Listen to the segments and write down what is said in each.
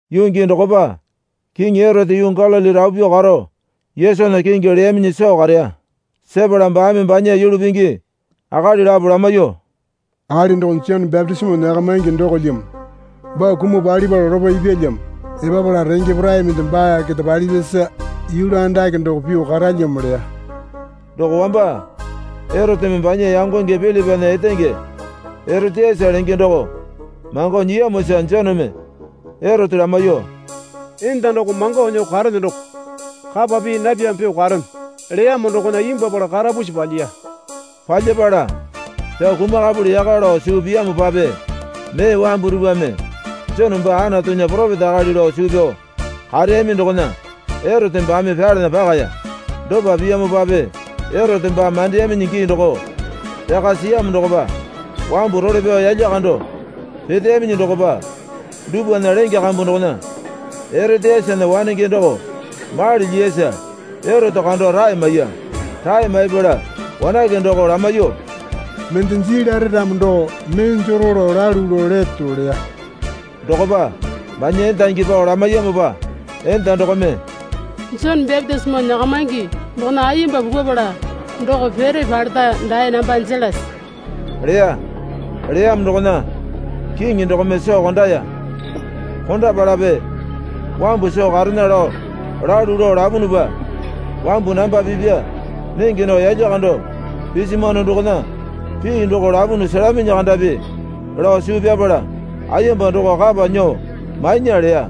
Yuu gii dokopa Kiŋi Erote yuu Galili rapu pyuo karo Yesunya kingi leyaminyi soo kareya. Sepala baame banya yulu pingi akali lapo lamaiyuo, Akali doko Jone bapitisimo nyakamaingi dokolyamo. Baa kumuo palipala lopo ipyalyamo. Epapala renge porai mende baa keta palipyasa yulu andake doko pyuo karalyamo, leya. Doko wamba Eroteme banya yangonge Pilipana etenge Eroteyase lenge doko mango nyiyamosa Joneme Erote lamaiyuo, Enda doko mango nyuo karene doko kapa pii napyamo pyuo karene leyamo dokona imbwuapala karapusi palyiya. Palyapala pyao kumakapuli yaka lao suu piyamopape mee wambu dupwame Jone baa Anatunya poropeta akali lao suu pyao kareyami dokona Erote baame pyalana pakaya. Dopa piyamopape Erote baa mandeyaminyi gii doko pyaka siyamo dokopa wambu role pyao yalya kando peteyaminyi dokopa dupwana lenge kambu dokona Eroteyasena wanenge doko mali lyiyasa Erote kando rae maiya. Rae maipala wanake doko lamaiyuo, Mende jii lare ramo doko mee jero lao lalu lao leto, leya. Dokopa banya endangi pao lamaiyamopa enda dokome, Jone bapitisimo nyakamaingi dokona ayemba pukupala doko pere paleta dae namba jelase, leya. Leyamo dokona kiŋi dokome soo kondaya. Kondapalape wambu soo karena lao lalu lao lapunupa, wambu namba pipya nenge nao yalya kando pisimwano dokona pii doko lapunu selaminyi kandapi lao suu pyapala ayemba doko kapa nyuo mainya leya.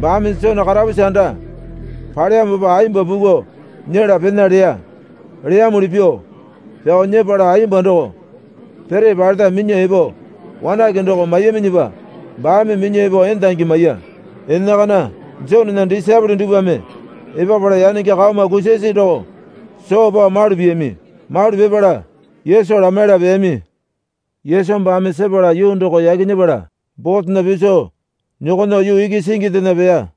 Baame Jone karapusi anda paleyamopa ayemba puku nyela pena leya. Leyamuli pyuo pyao nyepala ayemba doko pere paleta minyuo epo wanake doko maiyaminyipa baame minyuo epo endangi maiya. Enakana Jonena disaepole dupwame epapala yanenge kaoma kusasi doko soo pao malu piyami. Malu pipala Yesu lamaiyala peyami. Yesu baame sepala yuu doko yaki nyepala botena piso nyokonyuo yuu iki singindena peya.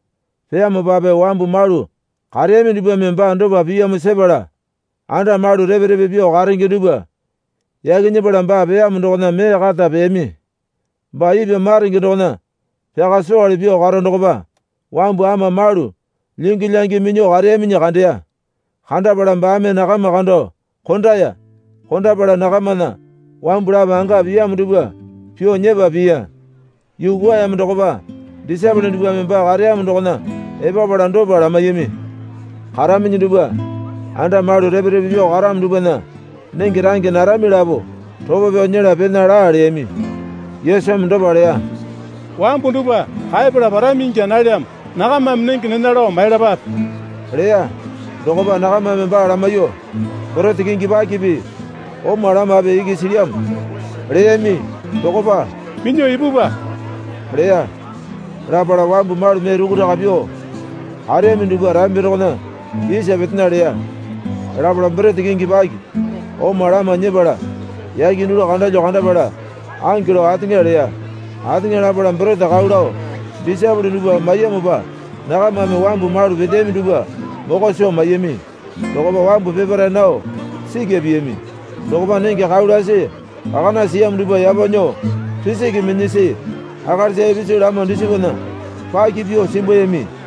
Peyamopape wambu malu kareyami dupwame baa dopa piyamo sepala anda malu repe repe pyuo karenge dupwa yaki nyepala baa peyamo dokona mee kata peyami. Baa ipwa maronge dokona pyaka sowale pyuo karo dokopa wambu ama malu lyingi lyangi minyuo kareyaminyi kandeya. Kandapala baame nakama kando kondaya. Kondapala nakamana wambu lapo anga piyamo dupwa pyuo nyepa piya. Yuu kwuayamo dokopa disaepole dupwame baa kareyamo dokona epapala dopa lamaiyami. Karaminyi dupwa anda malu repe repe pyuo karamo dupwana nenge range narami lapo ropo pyao nyela pena laa, leyami. Yesumi dopa leya. Wambu dupwa kaepala parami ingya nalyamo. Nakamame nenge nena lao maiyalapape, leya. Dokopa nakamame baa lamaiyuo, Borete kingi pakipi oma lamape iki silyamo, leyami. Dokopa, Minyuo ipupwa, leya. Lapala wambu malu mee rukuraka pyuo kareyami dupwa rambi dokona isa petena leya. Lapala borete kingi paki oma lama nyepala yake dulu kandalyo kandapala ange lao ateŋa leya. Ateŋa lapala borete kau lao disaepole dupwa maiyamopa nakamame wambu malu peteyami dupwa mokwa soo maiyami. Dokopa wambu peparae nao sikya piyami. Dokopa nenge kau lasi kakana siyamo dupwa yapo nyuo pisiki minyasi akalisa ipisu lama dusipana paki pyuo simbuyami.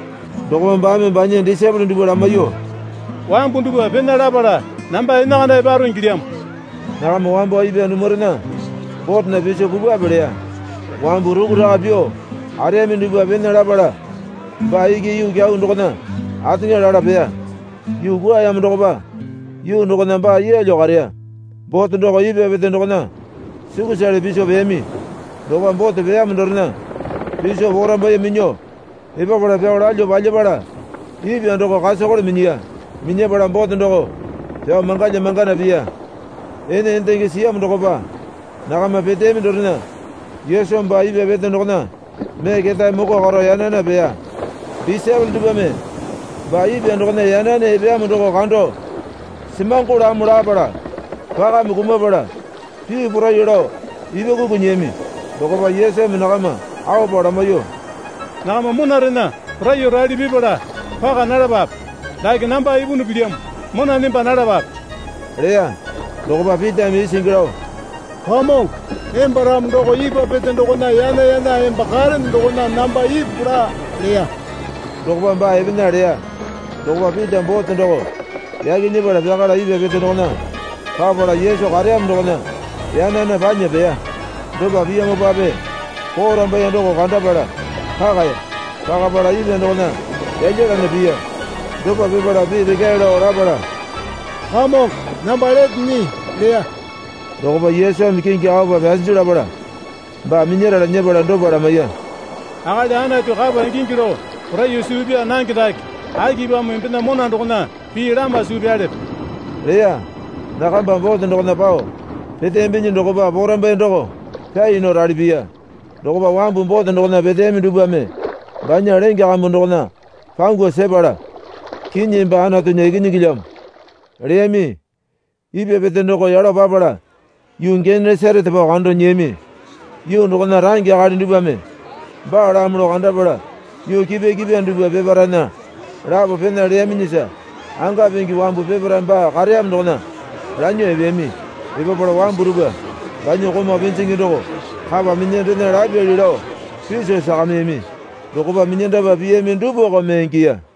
Dokopa baame banya disaepole dupwa lamaiyuo, Wambu dupwa pena lapala namba enakana eparo ingilyamo. Nakama wambo ipwa dumurena botena piso pupwape leya. Wambu rukuraka pyuo kareyami dupwa pena lapala baa iki yuu kyau dokona ateŋa lala peya. Yuu kwuayamo dokopa yuu dokona baa yeelyo kareya. Bote doko ipwa pete dokona sukusale piso peyami. Dokopa bote peyamo dorena piso porambaiye minyuo epapala pyao lalyuo palyapala ipwa doko kasokole minyiya. Minyapala bote doko pyao mangalya mangana piya. Ene endenge siyamo dokopa nakama peteyami dorena Yesu baa ipwa pete dokona mee ketae moko karo yana yana peya. Disaepole dupwame baa ipwa dokona yana yana epeyamo doko kando semangolamo lapala pakame kumapala pii poraiyuo lao ipwa kuku nyiyami. Dokopa Yesumi nakama aopa lamaiyuo, Nakama monarena poraiyuo rali pipala paka nalapape. Dake namba ipunu pilyamo. Mona nemba nalapape, leya. Dokopa Pitame isingi lao, Kamongo, emba ramo doko ipwa pete dokona yana yana emba karene dokona namba ipu laa, leya. Dokopa baa epena leya. Dokopa Pita bote doko yaki nyepala pyakala ipwa pete dokona papala Yesu kareyamo dokona yana yana panya peya. Dopa piyamopape porambaiye doko kandapala pakaya. Pakapala ipwa dokona yalyalana piya. Dopa pipala pii rekyae lao lapala, Kamongo namba lete nyii, leya. Dokopa Yesumi kingi aopa pyasinju lapala baa minyarala nyepala dopa lamaiya. Akali Anatu kapa ingingi lao poraiyuo suu pyaa nange dake, akipamo embena mona dokona pii lama suu pyalepe? leya. Nakamba bote dokona pao peteyambinyi dokopa porambaiye doko pyai nao rali piya. Dokopa wambu bote dokona peteyami dupwame banya lenge kambu dokona pangu sepala, Kinyi emba Anatunya Ikinyingilyamo leyami. Ipwa pete doko yalo papala yuu Genesarete pao kando nyiyami. Yuu dokona range akali dupwame baalamo lao kandapala yuu kipwa kipwa dupwa peparaena lapo pena leyaminyisa anga pingi wambu peparae baa kareyamo dokona lanyuo epeyami. Epapala wambu dupwa banya komau pinjingi doko kapa minyandena lapyali lao piso sakamiyami. Dokopa minyandapa piyami dupwako mee ingiya.